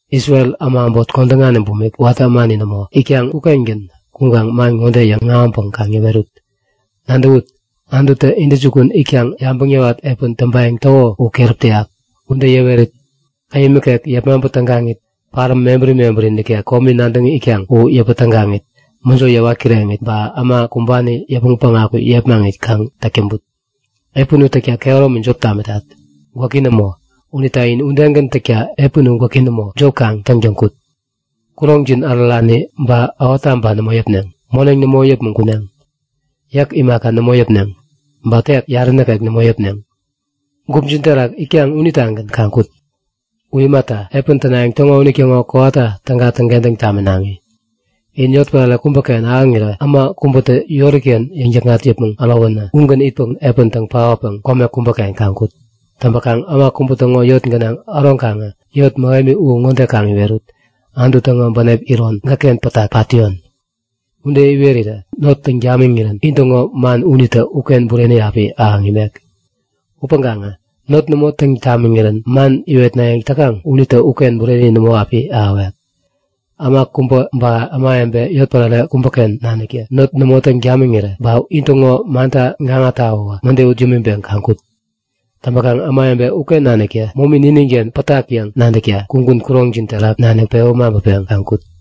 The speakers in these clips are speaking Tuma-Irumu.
Isrel äma äbot kodäŋani bumik, watä ämani nämo, itkaŋ ukengän kuŋkaŋ man ŋode yäŋahäŋpäŋ kaŋ yäwerut; Nadäwut! Anututä intäjukun itkaŋ yabäŋ yäwat epän täŋpayäŋ täko u keräp täyak. Ude yäwerit, käyäm nikek yepmaŋpä tägaŋit, paräm mebäri mebäri nikek komi nadäŋ itkaŋ u yäpä tägaŋit, mäjo yäwat kireŋit ba äma kumbani yäpmäŋ päŋaku yepmaŋit kaŋ täk täŋput. Epän u täkta kehäromi jop tamitat, gwäki nämo unita in udegän täŋkentäk epän u gwäki nämo, jop kaŋ täŋtäŋ kut. Kuroŋjin ärärani ba ähottaba nämo yäpneŋ. Moneŋ nämo yäpmäŋ kuneŋ, yäk imaka nämo yäpneŋ. Ba tek yarä nikek nämo yäpneŋ, gupjin terak itkaŋ unitagän kaŋ kut. U imata, epän tänayäŋ täŋo unitäŋo kowata täga täŋkentäŋ taminaŋi. In yotpärare kubäken ahäŋirä äma kubätä yori-ken yäŋ-täkŋat yäpmäŋ ärowänä ugän itpäŋ epän täŋ paotpäŋ kome kubäken kaŋ kut. Täŋpäkaŋ äma kubä täŋo yot gänaŋ äroŋkaŋä yot mähemi u ŋode kaŋ iwerut; Anutu täŋo bänep iron gäkken pat täyon! Ude iwerirä not täŋ tamiŋirän intäŋo man unitä uken bureni api ahäŋ imek. Upäŋkaŋä not nämo täŋ tamiŋirän man iwetnayäŋ täkaŋ unitä uken bureni nämo api ahäwek. Äma kubä ba ämawebe yotpärare kubäken naniktä not nämo täŋ tamiŋirä ba intäŋo manta gaŋa tawäwä mäde ut yämiŋpeŋ kaŋ kut! Täŋpäkaŋ ämawebe uken naniktä momi nininken pätak yäŋ nadäkta kugun kuroŋjin terak nanik pewä maŋpäpeŋ kaŋ kut.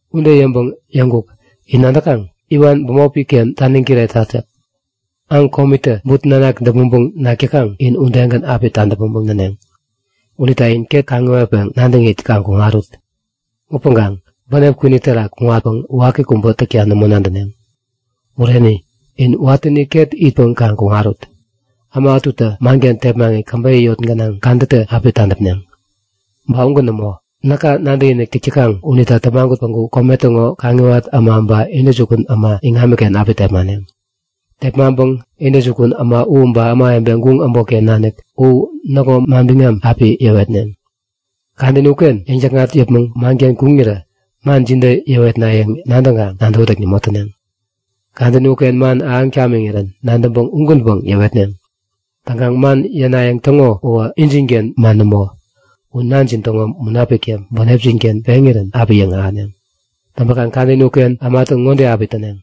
Ude yäŋpäŋ yäŋkuk; In nadäkaŋ? Iwan bämopi-ken taniŋ kiretat yäk. Aŋ komitä but nanak däpmäŋpäŋ nak täkaŋ in udegän api tadäpmäŋpäŋ näneŋ. Unita in ket kaŋiwatpäŋ nadäŋit kaŋ kuŋarut. Upäŋkaŋ bänep kwini terak kuŋatpäŋ waki kubä täkta nämo nadäneŋ. Bureni, in watäni ket itpäŋ kaŋ kuŋarut! Äma ätutä manken tepmaŋit käbeyä yot gänaŋ kadätä api tadäpneŋ. Ba ugän nämo, näka nadäkinik täk täkaŋ unita tämagut päŋku kome täŋo kaŋiwat äma ba intäjukun äma iŋamiken api tepmaneŋ. Tepmaŋpäpäŋ intäjukun äma u ba ämawebe guŋ äbotken nanik u näkŋo manbiŋam api yäwetneŋ. Kadäni uken yäŋ-täkŋat yäpmäŋ manken kuŋirä man jide yäwetnayäŋ nadäŋkaŋ nadäwätäk nämo täneŋ. Kadäni uken man ahäŋ tamiŋirän nadäŋpäŋ ugänpäŋ yäwetneŋ. Täŋkaŋ man yänayäŋ täŋo uwä injinken man nämo, u Nanjin täŋo Munapiktä bänepjin-ken peŋirän api yäŋahäneŋ. Täŋpäkaŋ kadäni uken ämatä ŋode api täneŋ;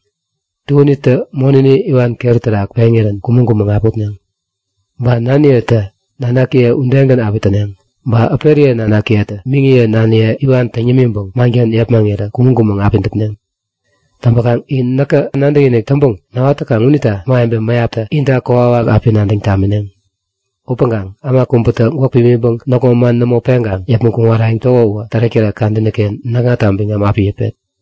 Tuänitä monäni iwan keri-ken peŋirän kumäŋ-kumäŋ api utneŋ. Ba naniyetä nanakiye udegän api täneŋ. Ba äperiye nanakiyetä miŋiye naniye iwan täŋ yämiŋpäŋ manken yepmaŋirä kumäŋ-kumäŋ api däpneŋ. Täŋpäkaŋ in näka nadäkinik täŋpäŋ näwat täkaŋ unita ämawebe mäyaptä inta kokwawak api nadäŋ tamineŋ. Upäŋkaŋ äma kubätä gwäk pimiŋpäŋ näkŋo man nämo peŋkaŋ yäpmäŋ kuŋarayäŋ täko uwä tärek-tärek kadäni-ken näkŋata biŋam api yäpet.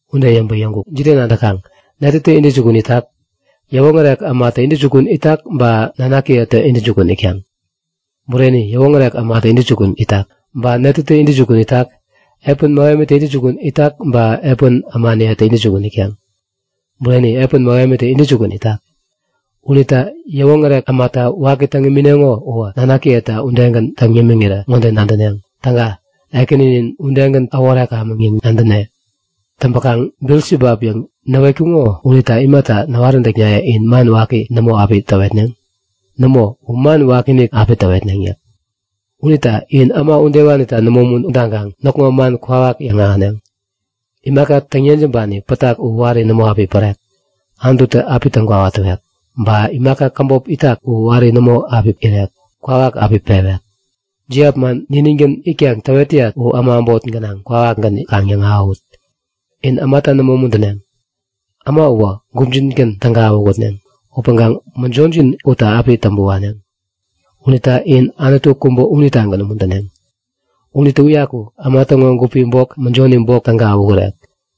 Ude yäŋpäŋ yäŋkuk; Jide nadäkaŋ? Netätä intäjukun itak? Yäwoŋärek ämatä intäjukun itak ba nanakiyetä intäjukun itkaŋ? Bureni, yäwoŋärek ämatä intäjukun itak! Ba netätä intäjukun itak? Epän mähemitä intäjukun itak ba epän ämaniyetä intäjukun itkaŋ? Bureni, epän mähemitä intäjukun itak. Unita yäwoŋärek ämata waki täŋ imineŋo uwä, nanakiyeta udegän täŋ yämiŋirä ŋode nadäneŋ; Täga! Ekäninin udegän äworekamäŋ yäŋ nadäne. Täŋpäkaŋ Bilisibap yäŋ näwetkuŋo unita imata näwaräntäknaye in man waki nämo api täwetneŋ? Nämo, u man wakiinik api täwetneŋ yäk. Unita in äma udewanita nämo umuntaŋkaŋ näkŋo man kwawak yäŋahäneŋ. Imaka täŋ-yejämbani pätak u wari nämo api pärek. Anututä api täŋkwawa täwek. Ba imaka käbop itak u wari nämo api irek. Kwawak api pewek. Jiap man niningän itkaŋ täwet täyat u äma äbot gänaŋ kwawakgän kaŋ yäŋahäwut! In ämata nämo umuntäneŋ. Äma uwä gupjingän täga awähutneŋ, upäŋkaŋ mäjojin utta api täŋpä waneŋ. Unita in Anutu kubä unitagän umuntäneŋ. Unitä uyaku äma täŋo gupi bok, mäjoni bok täga awähurek.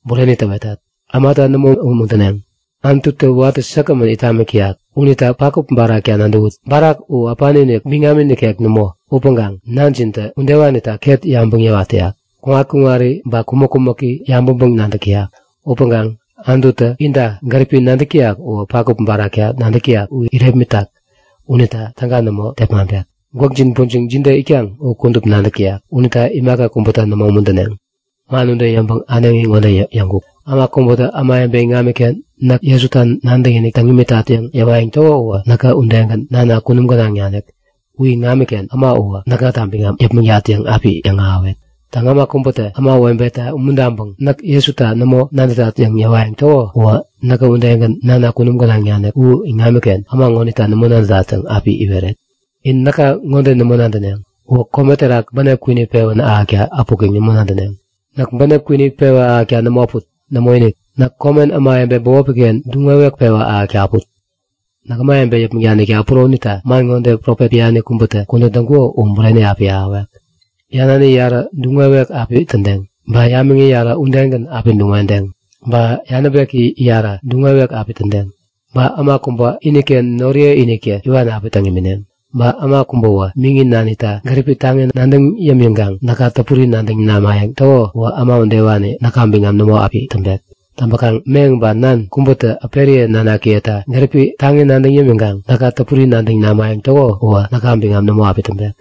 Bureni täwetat; Ämata nämo umuntäneŋ. Anututä watä säkgämän it tamik täyak. Unita pakup barakta nadäwut. Barak u äpani-inik, biŋami nikek nämo upäŋkaŋ Nanjintä udewanita ket yabäŋ yäwat täyak. Kuŋat-kuŋari ba kumäk-kumäki yabäŋpäŋ-nadäk täyak. Upäŋkaŋ Anututä inta gäripi nadäk täyak uwä pakup barakta nadäk täyak u irepmitak unita täga nämo tepmaŋpek. Gwäkjin pujiŋ jide itkaŋ u kudup nadäk täyak. Unita imaka kubäta nämo umuntäneŋ. Man ude yäŋpäŋ äneŋi ŋode yäŋkuk; Äma kubätä ämawebe iŋamiken näk Jesuta nadäkinik täŋ imitat yäŋ yäwayäŋ täko uwä näkä udegän Nana kunum gänaŋ nanik u iŋamiken äma uwä näkŋata biŋam yäpmäŋtat yäŋ api yäŋahäwet. Täŋ, äma kubätä ämawebeta umuntaŋpäŋ näk Jesuta nämo nadätat yäŋ yäwayäŋ täko uwä näkä udegän Nana kunum gänaŋ nanik u iŋamiken äma ŋonita nämo nadätat yäŋ api iweret. In näka ŋode nämo nadäneŋ; Uwä kome terak bänep kwini pewän ahäkta äpuk yäŋ nämo nadäneŋ. Näk bänep kwini pewa ahäkta nämo äput. Nämoinik! Näk komen ämawebe bämopi-ken duŋ-wewek pewa ahäkta äput. Näk ämawebe yäpmäŋ danikta äpuro unita man ŋode profet biani kubätä kudän täŋkuko u bureni api ahäwek; Yanani yarä duŋ-wewek api tädeŋ, ba yamiŋi yarä udegän api duŋ-wedeŋ. Ba yanäbeki yarä duŋ-wewek api tädeŋ. Ba äma kubä iniken noriyeiniktä iwan api täŋ imineŋ. Ba äma kubäwä miŋi nanita gäripi taŋi nadäŋ yämiŋkaŋ näka täpuri nadäŋ namayäŋ täko uwä äma udewani näka biŋam nämo api täŋpek. Täŋpäkaŋ meŋ ba nan kubätä äperiye nanakiyeta gäripi taŋi nadäŋ yämiŋkaŋ näka täpuri nadäŋ namayäŋ täko uwä näka biŋam nämo api täŋpek.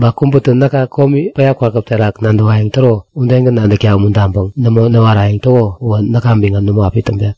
Ba kubätä näkä komi päya kwakäp terak nadäwayäŋ täro udegän nadäkta umuntaŋpäŋ nämo näwarayäŋ täko uwä näka biŋam nämo api täŋpek.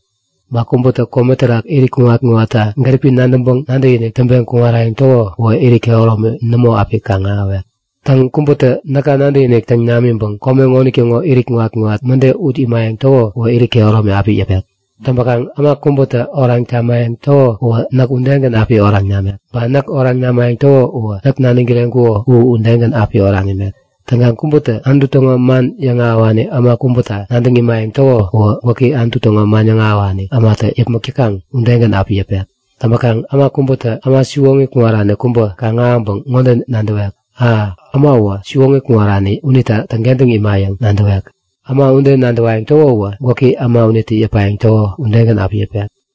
Ba kubätä kome terak irit kuŋat-kuŋatta gäripi nadäŋpäŋ nadäkinik täŋpeŋ kuŋarayäŋ täko uwä irit kehäromi nämo api kaŋ-ahäwek. Täŋ, kubätä näka nadäkinik täŋ namiŋpäŋ kome ŋonitäŋo irit kuŋat-kuŋat mäde ut imayäŋ täko uwä irit kehäromi api yäpek. Täŋpäkaŋ äma kubätä oraŋ tamayäŋ täko uwä näk udegän api oraŋ namek. Ba näk oraŋ namayäŋ täko uwä näk naniŋ kireŋkuko u udegän api oraŋ imek. Täŋkaŋ kubätä Anutu täŋo man yäŋahäwani äma kubäta nadäŋ imayäŋ täko uwä gwäki Anutu täŋo man yäŋahäwani ämatä yäpmäk täkaŋ udegän api yäpek. Täŋpäkaŋ äma kubätä äma siwoŋi kuŋarani kubä kaŋ-ahäŋpäŋ ŋode nadäwek; A! Äma uwä siwoŋi kuŋarani unita täŋkentäŋ ima yäŋ nadäwek. Äma ude nadäwayäŋ täko uwä gwäki äma unitä yäpayäŋ täko udegän api yäpek.